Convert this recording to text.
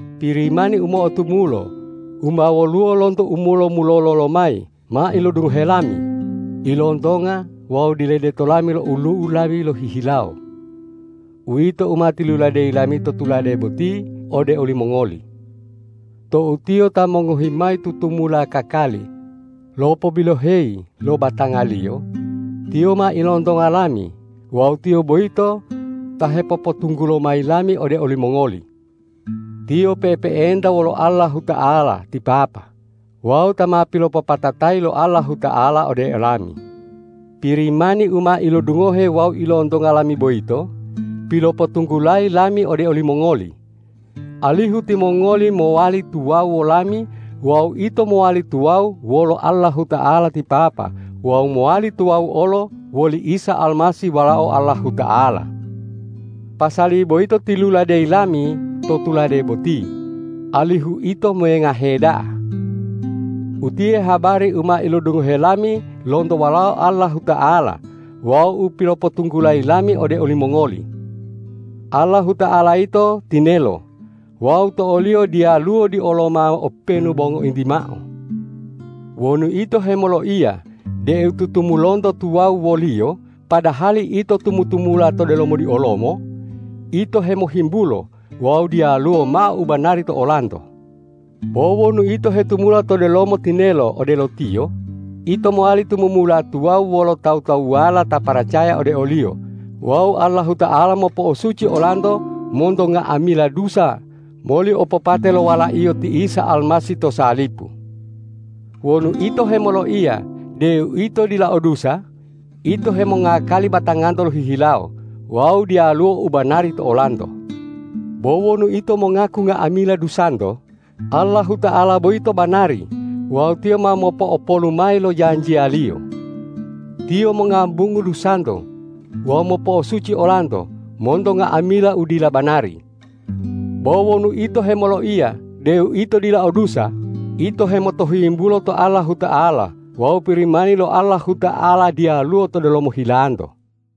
Pirimani u mo'otumulo u ma woluwo lonto u mulo-mulolo lomayi ma ilodungohe lami, ilontonga wawu diledeto lami lo olu'u lami lohihilawo. Uwito u ma tiluladeyi lami to tulade boti ode olimongoli. Tou Tiyo ta mongohi mayi tutumula kakali lopobiloheyi lo batanga-Liyo, Tiyo ma ilontonga lami wawu Tiyo boyito ta hepopotunggulo mayi lami ode olimongoli. Tiyo pe'epe'enta wolo Allahuta'ala ti Papa wawu ta ma pilopopatatayi lo Allahuta'ala ode olami. Pirimani u ma ilodungohe wawu ilontonga lami boyito pilopotunggulayi lami ode olimongoli, alihu timongoli mowali tuwawu wolami wawu ito mowali tuwawu wolo Allahuta'ala ti Papa wawu mowali tuwawu olo woli Isa Almasih Walao Allahuta'ala. Pasali boyito tiluladeyi lami to tulade boti alihu ito mengahe da'a. Utiye habari u ma ilodungohe lami lonto Walao Allahuta'ala wawu u pilopotunggulayi lami ode olimongoli. Allahuta'ala yito tinelo wawu to o-Liyo diyaluwo dioloma openu bo ngointi mao. Wonu ito hemoloiya deu tutumulunto tuwawu wo-Liyo padahali ito tumu-tumula to delomo diolomo, ito hemohimbulo wawu diyaluwo mao u banari to olanto. Bo wonu ito hetumula to delomo tinelo odelo Tiyo, ito mowali tumumula tuwawu wolo tawu-tawuwala ta paracaya ode o-Liyo wawu Allahuta'ala mopo'osuci olanto monto nga'amila dusa moli opopate lo Wala-Iyo ti Isa Almasih to salipu. Wonu ito hemoloiya deu ito dila o dusa, ito hemongakali batanganto lohihilawo wawu diyaluwo u banari to olanto. Bo wonu ito mongaku nga'amila dusanto, Allahuta'ala boyito banari wawu Tiyo ma mopo'opolu mayi lo janjiya-Liyo. Tiyo mongambungu dusanto wawu mopo'osuci olanto monto nga'amila u dila banari. Bo wonu ito hemoloiya deu ito dila o dusa, ito hemotohuyimbulo to Allahuta'ala wawu Pirimani lo Allahuta'ala diyaluwo to delomo hilanto.